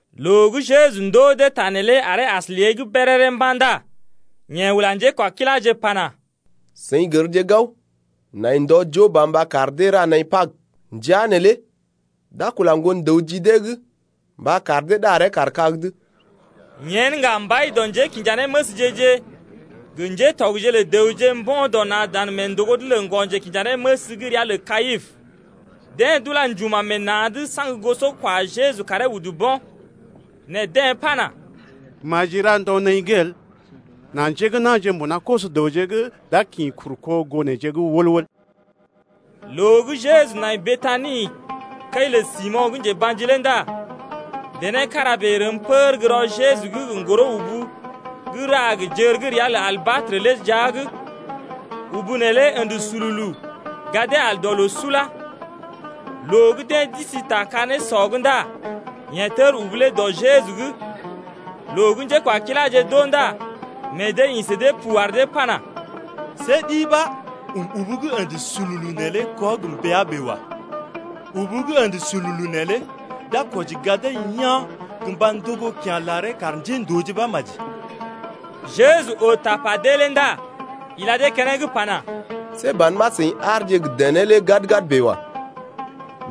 Loo gə́ Jeju ndoo dee ta neelé aree as lée’g béréré mba̰ ndá yeḛ ula njékwakiláje pana: Seḭ gərje gao, nai ndɔ joo ba mba kar dee ra naḭ Pag, ndəa neelé d’a kula Ŋgon-dəw ji dee’g mba kar dee ɗaree kaar kag’d. Yen ŋga mbai dɔ njékinjanéməsje-je gə ŋgatɔgje lə dəwje mbo̰ dɔ na̰ dan mee ndògo’d lə ŋgɔ-njekinjanéməs gə́ ria lə Kayipə. Deḛ d’ula njuma̰ meḛ na̰’d saŋg goso kwa Jeju karee udu bo̰. Nɛ deḛ pana: Maji ra ndɔ naḭ’g el, nà njé gə́ na̰je gə́ mbuna koso-dəwje’g d’a kḭ kuru kó goo neḛje’g wəl-wəl. Loo gə́ Jeju nai Betani kəi lə Simo̰ gə́ njeba̰ji lé ndá dené kára bèe rəm pər gə́ rɔ Jeju’g gə ŋgoro-ubu gə́ ra gə jər gə́ ria lə albatrə lé jia’g, ubu neelé ə̰də sululu gadee al dɔ loo sula. Loo gə́ deḛ d’isi ta ka-nésɔ’g ndá yeḛ tər ubu lé dɔ Jeju’g. Loo gə́ njékwakiláje d’oo ndá meḛ dee ḭ sə dee pu ar dee pana: See ɗi ɓa ɔm ubu gə́ ə̰də sululu neelé kɔ gə mbəa bèe wa. Ubu gə́ ə̰də sululu neelé d’a kwɔji gadee yaa̰ gə mba ndogo kya̰ laree kar njéndooje ɓa maji. Jeju oo tapa dee lé ndá ila dee keneŋ pana: See ban ɓa seḭ aarje gə dené lé gad-gad bèe wa.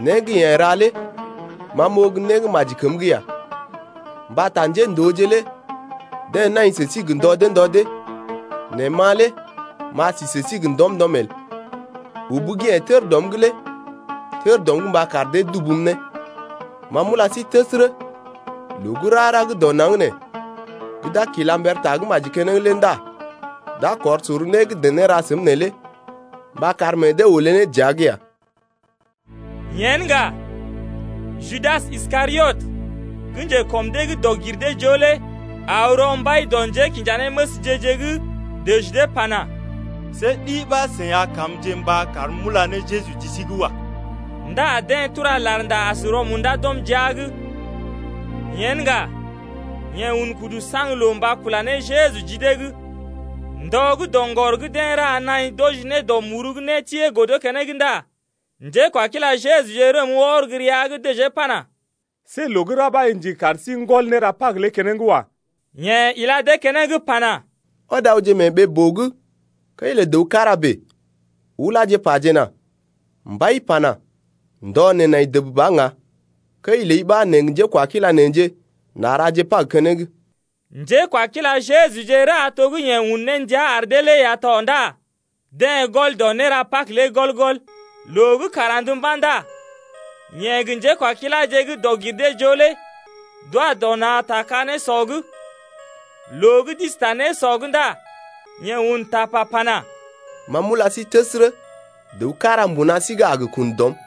Né gə́ yeḛ ra lé ma m’oo gə́ né gə́ maji kəm’g ya. Mbata njéndooje lé deḛ nai sə sí gə ndɔ dee ndɔ dee, nɛ ma lé m’a si sə sí gə ndɔm-ndɔm el. Ubu gə́ yeḛ tər dɔm’g lé tər dɔm’g mba kar dee dubum ne. Ma m’ula sí təsərə, loo gə́ rara gə́ dɔ naŋg nee gə́ d’a gə kila mber tagə́maji keneŋ lé ndá d’a kɔr sor né gə́ dené ra səm neelé mba kar meḛ dee olé ne dəa’g ya. Yen ŋga, Judas Iskariot gə́ njekɔm dee gə́ dɔg-gir-dee-joo lé aw rɔ mbai dɔ njékinjanéməsje-je’g dəji dee pana: See ɗi ɓa seḭ a kamje mba karm m’ula ne Jeju ji sí’g wa. Ndá deḛ tura larnda as rɔ-munda d’ɔm jia’g. Yen ŋga, yeḛ un kudu saŋg loo mba kula ne Jeju ji dee’g. Ndɔ gə́ doŋgɔr gə́ deḛ ra naḭ d’wɔji ne dɔ muru gə́ nétiee godo keneŋ ndá njékwakila Jejuje rəm wɔr gə́ rəa’g dəjee pana: See loo gə́ ra ɓa i ndigi kar sí n’gɔl néra Pag lé keneŋ wa. Yeḛ ila dee keneŋ pana: Ɔd awje mee ɓee-boo’g kəi lə dəw kára bèe, ulaje pajena: Mbai pana: ndɔ neḛ nai dəb ba ŋga, kəi ləi ɓa neḛ gə njékwakila neḛje n’a raje Pag keneŋ. Njékwakila Jejuje ra to gə́ yeḛ un ne ndia ar dee lé ya tɔ ndá deḛ gɔl dɔ néra Pag lé gɔl-gɔl. Loo gə́ kàr andə mba̰ ndá yeḛ gə njékwakiláje gə́ dɔg-gir-dee-joo lé d’wa dɔ na̰ ta ka-nésɔ’g. Loo gə́ d’isi ta nésɔ’g ndá yeḛ un tapa pana: Ma m’ula sí təsərə, dəw kára mbuna sí’g a gə kun dɔm.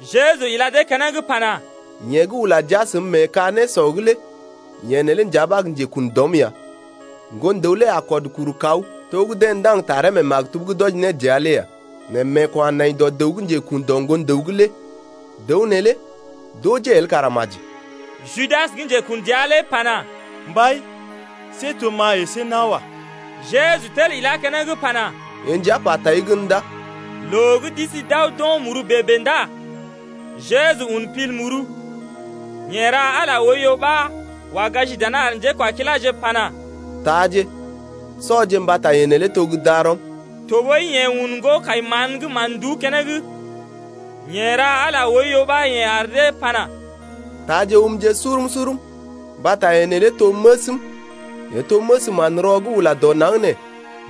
Jeju ila dee keneŋ pana: Yeḛ gə́ ula jia səm mee ka-nésɔ’g lé yeḛ neelé nja ɓa gə́ njekun dɔm ya. Ŋgon-dəw lé a kɔd kuru kaw to gə́ deḛ ndaŋg ne taree mee maktub’g d’wɔji ne dəa lé ya. Nɛ meeko̰ a nai dɔ dəw gə́ njekun dɔ Ŋgon-dəw’g lé. Dəw neelé d’ojee el kara maji ya. Judas gə́ njekun dəa lé pana: Mbai, see to gə́ ma əsé nawa. Jeju tel ilá keneŋ pana: Yee nja pa tai gən ndá. Loo gə́ d’isi d’aw d’o̰ muru bèe-bèe ndá Jeju un pil muru, yeḛ ra Ala lé oiyo ɓa wa gaji dana ar njékwakiláje pana: Taaje, sɔje mbata yee neelé to gə́ darɔm. Tɔɓəi yeḛ un ŋgo-kai-mán gə́ mán-nduú keneŋ, yeḛ ra Ala oiyo ɓa yeḛ ar dee pana: Taaje umje surum-surum, mbata yee neelé to məsm, yee to məs manrɔ gə́ ula dɔ naŋg nee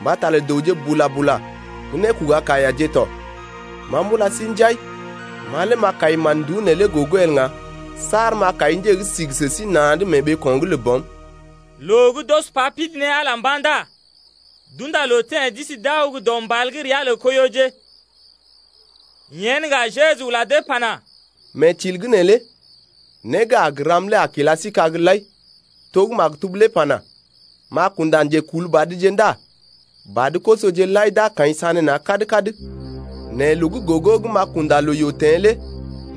mbata lə dəwje bula-bula gə nékoga kaiyaje tɔ. Ma m’ula sí njai, ma lé m’a kai mán-nduú neelé gogo el ŋga saar m’a kai nje gə́ sigi sə sí na̰’d mee ɓeeko̰’g lə Bɔm. Loo gə́ d’ɔs pa pidi ne Ala lé mba̰ ndá d’unda loo teḛ d’isi d’aw gə́ dɔ mbal gə́ ria lə Koiyoje. Yen ŋga Jeju ula dee pana: Mee til’g neelé né gə́ a gə ram lé a kila sí kag lai, to gə́ maktub lé pana: M’a kunda njekulbadje ndá badə-kosoje lai d’a kaḭ sanéna̰ kad-kad. Nɛ loo gə́ gogo gə́ m’a kunda loo-yoo teḛ lé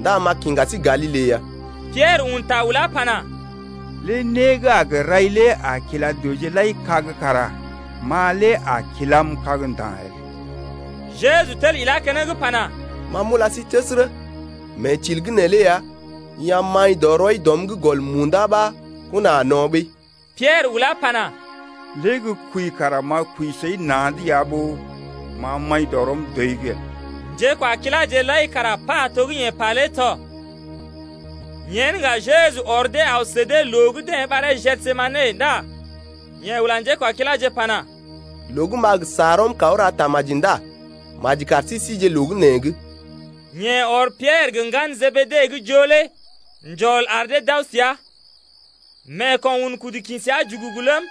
ndá m’a kiŋga sí Galile ya. Piɛrə un ta ulá pana: Lé né gə́ a gə rai lé a kila dəwje lai kag kara ma lé a kilam kag nda̰ el. Jeju tel ilá keneŋ pana: Ma m’ulai təsərə, mee til’g neelé ya, i a maḭ dɔ rɔi dɔm’g gɔl munda ɓa kona a no̰ ɓəi. Piɛrə ulá pana: Lé gə́ kwəi kara m’a kwəi səi na̰’d ya ɓó m’a maḭ dɔ rɔm dɔi’g el. Njékwakiláje lai kara pa to gə́ yeḛ pa lé tɔ. Yen ŋga Jeju ɔr dee aw sə dee loo gə́ deḛ ɓaree Gesemane ndá yeḛ ula njékwakiláje lé pana: Loo gə́ m’a gə sa rɔm kaw ra tamaji ndá maji kar sí sije loo gə́ nee’g. Yeḛ ɔr Piɛrə gə ŋgalə Jebede gə́ joo lé njɔl ar dee d’aw səa. Meeko̰ un kudu kḭ səa jugugu ləm,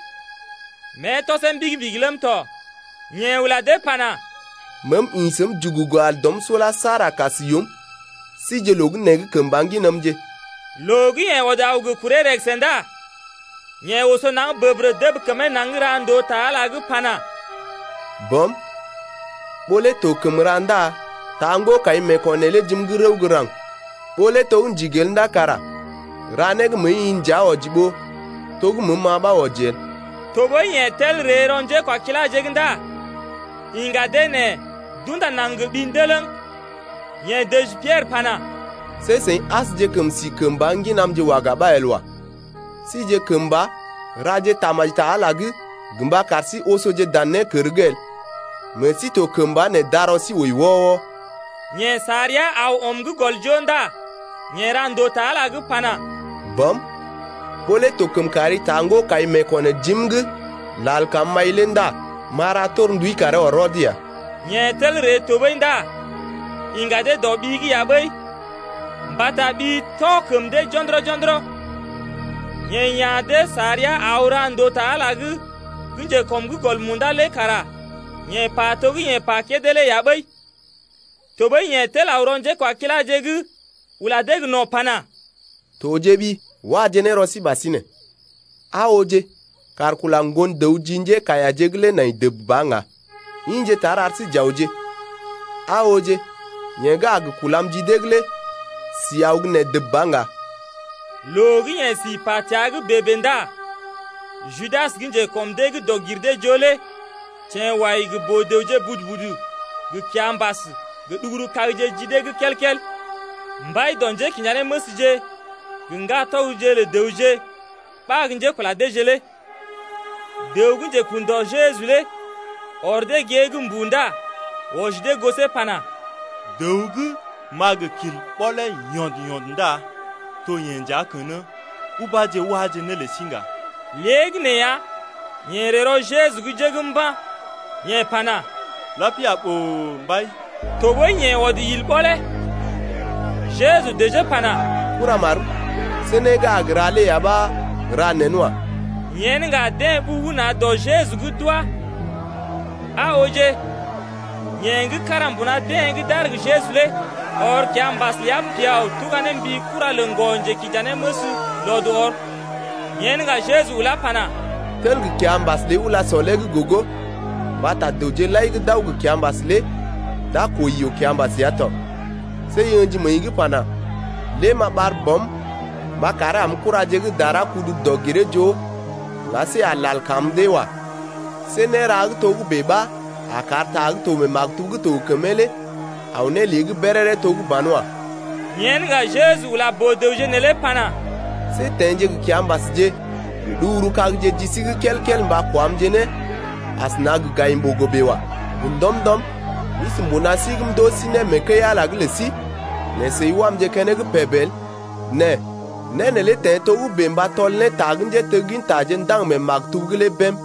mée tɔsee mbigi-mbigi ləm tɔ. Yeḛ ula dee pana: Meem ḭ səm jugugu al dɔm sula saar a kas yoom. Sije loo gə́ nee’g kəmba ŋginamje. Loo gə́ yee ɔd aw gə kuree rəgəsə ndá yeḛ oso naŋg bəbərə dəb kəmee naŋg ra ndòo ta Ala’g pana: Bɔm, ɓó lé to kəm ra ndá taa ŋgo-kai meeko̰ neelé jim’g rəw gə́ raŋg. Ɓó lé to gə́ ndigi el ndá kara ra né gə́ məəi-i nja wɔji ɓó to gə́ məəm-ma ɓa wɔji el. Tɔɓəi yeḛ tel ree rɔ njékwakiláje’g ndá iŋga dee nɛ d’unda naŋg gə ɓi ndələŋ, yeḛ dəji Piɛrə pana: See seḭ asjekəm sije kəmba ŋginamje waga ɓa el wa. Sije kəmba raje tamaji ta Ala’g lé gə mba kar sí osoje dan nékər’g el. Meḛ sí to kəmba nɛ darɔ sí wəi wɔ-wɔ. Yeḛ sa rəa aw ɔm gə́ gɔl joo ndá yeḛ ra ndòo ta Ala’g pana: Bɔm, ɓó lé to kəm kari taa ŋgo-kai meeko̰ nee jim’g lal kam m’ai lé el ndá m’a ra torndui karee ɔr rɔd ya. Yeḛ tel ree tɔɓəi ndá iŋga dee dɔ ɓi’g ya ɓəi mbata ɓi tɔ kəm dee jo̰dɔrɔ-jo̰dɔrɔ. Yeḛ ya̰ dee sa rəa aw ra ndòo ta Ala’g gə́ njekɔm’g gɔl munda lé kara yeḛ pa to gə́ yeḛ pa kédé lé ya ɓəi. Tɔɓəi yeḛ tel aw rɔ njékwakiláje’g ula dee gə no̰ pana: Tojeɓi, waje ne rɔ sí ɓasinè. Aa ooje kàr kula Ŋgon-dəw ji njékaiyaje’g lé nai dəb ba ŋga. Ḭje tar, ar sí j’awje. Aa ooje, yeḛ gə́ a gə kulam ji dee’g lé si aw gə́ nee dəb ba ŋga. Loo gə́ yeḛ si pa təa’g bèe-bèe ndá Judas gə́ njekɔm dee’g dɔg-gir-dee-joo lé teḛ wai gə boo-dəwje budu-budu gə kiambas gə ɗuguru-kagje ji dee’g kel-kel. Mbai dɔ njékinjanéməsje gə ŋgatɔgje lə dəwje ɓa gə́ njékula deeje lé. Dəw gə́ njekun dɔ Jeju lé ɔr dee gée’g mbuu ndá wɔji dee gosee pana: Dəw gə́ m’a gə kil ɓɔlee yɔnd-yɔnd ndá to yeḛ nja kən-ə ubáje, waje né lə sí ŋga. Léegəneeya, yeḛ ree rɔ Jeju’g jəgm mba̰, yeḛ pana: Lapia boo, mbai! Tɔɓəi yeḛ ɔd il ɓɔlee. Jeju dəjee pana: Kuramarm, see né gə́ a gə ra lé ya ɓa ra nen wa. Yen ŋga deḛ ɓugu na̰ dɔ Jeju’g d’wá. Aa ooje, yeḛ gə́ kára mbuna deḛ gə́ d’aar gə Jeju lé ɔr kiambas ləa piao tuga ne mbi kura lə ŋgɔ-njekinjanéməs lɔd ɔr. Yen ŋga Jeju ulá pana: Tel gə kiambas ləi ula sɔlee gogo mbata dəwje lai gə́ d’aw gə kiambas lé d’a kwəi yoo-kiambas ya tɔ. See i ə̰ji məəi’g pana: Lé m’a ɓar Bɔm mba karee am kuraje gə́ dara kudu dɔg-giree-joo ŋga see a lal kam dee wa. See nérea gə́ togə́bè ɓa a kar ta gə́ to mee maktub gə́ to gə kəmee lé aw ne lée’g béréré to gə́ banwa. Yen ŋga Jeju ula boo-dəwje neelé pana: See teḛje gə kiambasje gə ɗuguru-kagje ji sí’g kel-kel mba kwamje ne asəna gə gayim-ɓogo bèe wa. Gə ndɔm-ndɔm m’isi mbuna sí’g m’ndoo sí né mee kəi-Ala’g lə sí, nɛ seḭ wamje keneŋ peb el. Nɛ né neelé teḛ togə́bè mba tɔl ne ta gə́ njéteggintaje ndaŋg mee maktub’g lé bém.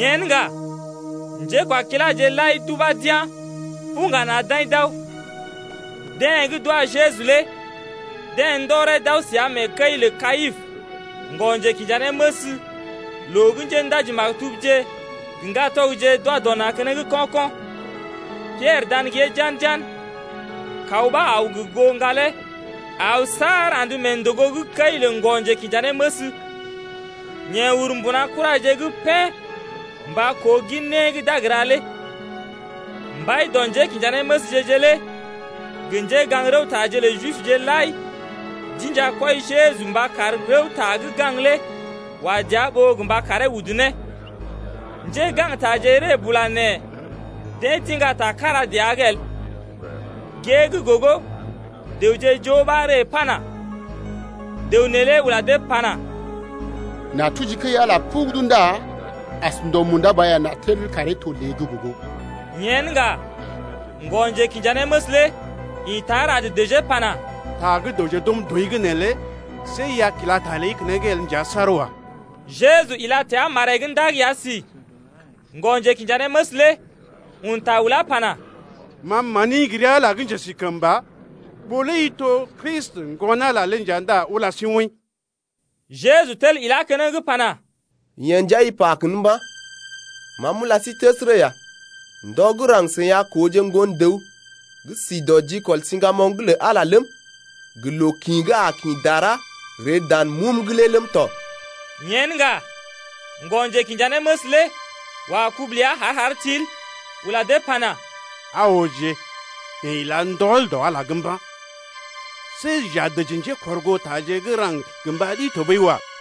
Yen ŋga njékwakiláje lai d’ubá d’yá̰ buŋga na̰ d’aḭ d’aw. Deḛ gə́ d’wa Jeju lé deḛ ndɔree d’aw səa mee kəi’g lə Kayipə ŋgɔ-njekinjanéməs loo gə́ njéndaji-maktubje gə ŋgatɔgje d’wa dɔ na̰ keneŋ ko̰-ko̰. Piɛrə dan gée jan-jan, kaw ɓa aw gə goo ŋgalee aw saar andə mee ndògo’g kəi lə ŋgɔ-njekinjanéməs. Yeḛ ur mbuna kuraje’g pén mba koo gin né gə́ d’a gə ra lé. Mbai dɔ njékinjanéməsje-je lé gə njégaŋ-rəwtaje lə Jibje lai d’inja kwɔi Jeju mba kar rəwta gə́ gaŋg lé wa dəa ɓó gə́ mba karee udu ne. Njégaŋgtaje ree bula nɛ deḛ d’iŋga ta kára dəa’g el. Gée gə́ gogo dəwje joo ɓa ree pana: Dəw neelé ula dee pana: N’a tuji kəi-Ala pugudu ndá as ndɔ munda ba ya n’a tel karee to lée’g gogo. Yen ŋga ŋgɔ-njekinjanéməs lé ḭta rad dəjee pana: Ta gə́ dəwje d’ɔm dɔi’g neelé see i a kila ta ləi keneŋ el nja saar wa. Jeju ila təa maree’g ndag ya si. Ŋgɔ-njekinjanéməs lé un ta ulá pana: Ma mani gə ri Ala gə́ njesikəmba, ɓó lé i to Kristi, Ŋgon-Ala lé nja ndá ula sí woḭ. Jeju tel ilá keneŋ pana: Yeḛ nja i pa kən mba̰. Ma m’ula sí təsərə ya, ndɔ gə́ raŋg seḭ a kooje Ŋgon-dəw gə́ si dɔ jikɔl siŋgamoŋ’g lə Ala lé ləm, gə loo kḭ gə́ a kḭ dara ree dan mum’g lé ləm tɔ. Yen ŋga ŋgɔ-njekinjanéməs lé wa kubu ləa har-har til ula dee pana: Aa ooje, yeḛ ila ndɔl dɔ Ala’g mba̰. See j’a dəji njékɔrgootaje gə́ raŋg gə mba ɗi tɔɓəi wa.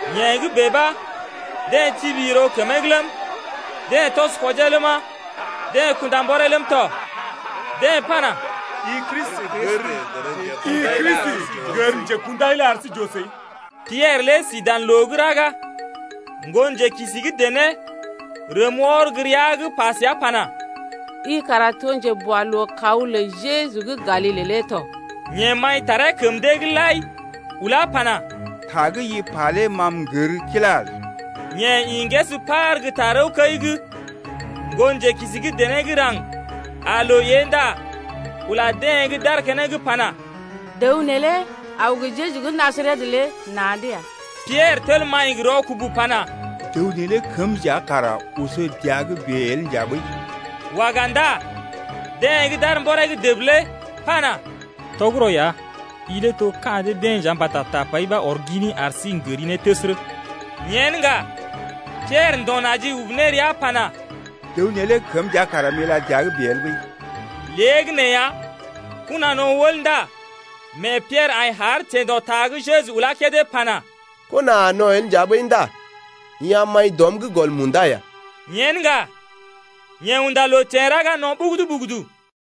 Yee gə́ bèe ɓa deḛ tibi yiro kəmee’g ləm, deḛ tɔs kwɔjee ləma, deḛ kunda mbɔree ləm tɔ. Deḛ pana: I Kristi, gər nje kundai lé ar sí j’oo səi. Piɛrə lé sí dan loo gə́ raga. Ŋgonjelookisi gə́ dené rəm wɔr gə́ rəa’g pa səa pana: I kara to njeboalookaw lə Jeju gə́ Galile lé tɔ. Yeḛ maḭtaree kəm dee’g lai ulá pana: Ta gə́ i pa lé ma m’gər kilá el. Yeḛ ḭ ŋgəs par gə́ tarəwkəi’g. Ŋgonjelookisi gə́ dené gə́ raŋg aa loo ée ndá ula deḛ gə́ d’aar keneŋ lé pana: Dəw neelé aw gə Jeju gə́ Najaret lé na̰’d ya. Piɛrə tel maḭ gə rɔkubu pana: Dəw neelé kəm nja kara oso dəa’g bèe el nja ɓəi. Waga ndá deḛ gə́ d’aar mbɔree’g dəb lé pana: Tɔgərɔ ya, i lé to ka̰ dee-deḛ nja mbata tapai ɓa ɔr gini ar sí n’gəri ne təsərə ya. Yen ŋga Piɛrə ndo̰ naji ubu ne rəa pana: Dəw neelé kəm nja kara m’ila dəa’g bèe el ɓəi. Léegəneeya kona no̰ wəl ndá mee Piɛrə aḭ har teḛ dɔ ta gə́ Jeju ulá kédé pana: Kona a no̰ el nja ɓəi ndá i a maḭ dɔm’g gɔl munda ya. Yen ŋga, yeḛ unda loo teḛ raga no̰ ɓugudu-ɓugudu.